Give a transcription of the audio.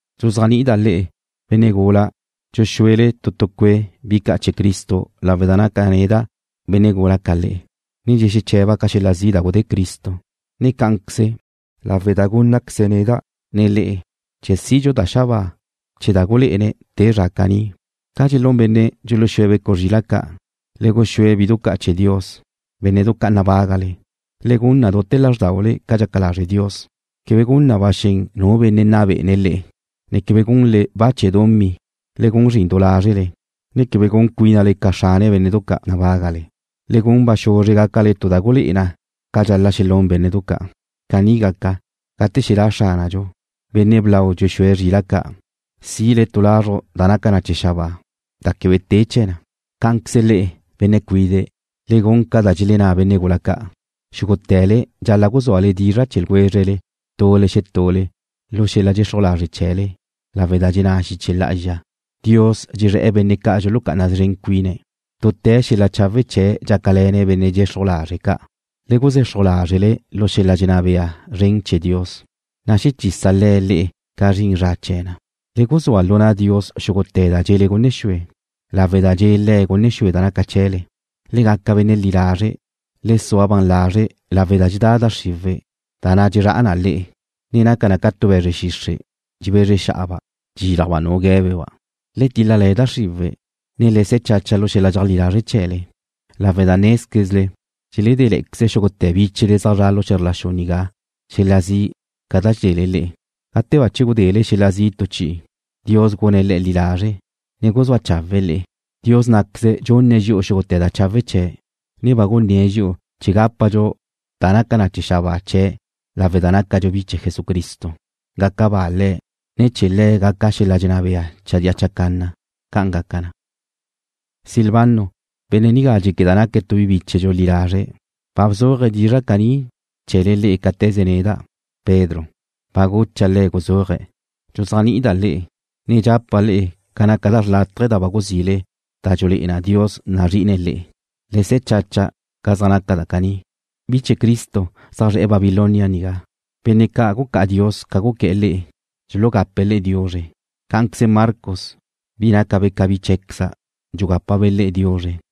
Dxuzéajni'ida' le'e, benne' gula dxuxúele tu tu cue' bi ca' chee̱ Cristo lawe' da naca' neda' benne' gula ca le'e, ne dxexeche̱ba' ca xel-la' zi' da gudé Cristo, ne cá'anqueze lawe' da gúnnaqueze̱' neda', ne le'e, chee̱ sidxu da xabáa chee̱' da gulé'ene̱' te chee̱ zra caní. Ca dxelún benne' dxuluxúe̱' zrila' ca', le guxúe bidu ca' chee̱ Dios, bénne'du ca' nabágale. Le gun na dute̱ lázrdaule ca dxaca lazre' Dios, quebe gun na ba xen nu benne' nna bé'ene̱' le'e, ne quebe gunle ba chee̱ dumí. Le gun zrin du lázrele, ne quebe gun cuínale ca xrane bénne'du ca' nabágale. Le gun ba xuzre gácale tu da gulé'e na ca dxal-la' xelún bénne'du ca'. Caní gaca, gate xelá' Xránadxu, Benne' Blau dxuxúe̱' zrila' ca', sile tu lazruj da naca na chee̱ xabáa, da quebe te chee̱ na. Cá'anqueze le'e, benne' cuide', le gun ca da dxelenná benne' gula ca'. Xúgute̱le dxal-la' guzúale dizra' chee̱ ljwézrele tule xetule lu xel-la' dxexruj lazre' chee̱le lawe' da dxenná xiche lá'azxa: Dios dxezré̱'e̱ benne' ca' dxulucá'ana szren cuine̱'. Dute̱ xel-la' chawe' chee̱' dxácale̱ne̱' benne' dxexruj lazre' ca'. Le guzexruj lázrele lu xel-la' dxenná bea zren chee̱ Dios, na' xechisa Le̱' le'e ca zrin zra chee̱ na. Le guzúa lu na' Dios xúgute̱ da dxele gunne xue, lawe' da dxe' Le̱' gunne xue da naca chee̱le. Le gaca benne' li lazre', ne le sua ban lazre' lawe' da dxedá da xriwe', da na' dxezrá'a na le'e, ne naca na ca tu be̱zre xixre', dxebezre xa'aba', dxíljaba' nu gué̱beba'. Le tíl-lale̱ da xriwe', ne le se̱ chacha lu xel-la' dxeajlí lazre' chee̱le, lawe' da nézquezle dxeledéqueze xúgute̱ bíchele zaj zre̱'e̱ lu xe̱zr la xu nigá xel-la' zi' ca da dxedele le'e. Gate bache gudele xel-la' zi' tu chi'i, Dios gune̱' le'e li lazre', ne guzúa chawe̱'e̱ le'e. Dios ná'queze dxunne̱' dxi'u xúgute̱ da chawe' chee̱', ne ba gunné̱' dxi'u chee̱ gápadxu da naca chee̱ xabáa chee̱' lawe' da nácadxu bi chee̱ Jesucristo. Gaca ba Le̱', ne chee̱' Le̱' gaca xel-la' dxenná bea chadía chacanna. ¡Ca'an gaca na! Silvano, benne' nigá dxéqueda' naque' tu bi bíchedxu li lazre', ba bzuaje̱' dizra' caní chee̱le le'e cáte̱ze neda', Pedro, ba gucha' le̱' guzúaje̱'. Dxuzéajni'ida' le'e, ne dxapa' le'e ca naca da xrlátaje da ba guzile da dxululé'e na Dios nazri'ine̱' le'e. Le se̱ chacha ca zaj naca da caní. Bi chee̱ Cristo zaj zre̱'e̱ Babilonia nigá, benne' ca' gucá'a Dios ca guqué̱'e̱ le'e, dxulugape̱' le'e diuzre. Cá'anqueze Marcos, bi na' nácabe' ca bi cheé̱queza' dxugápabe' le'e diuzre.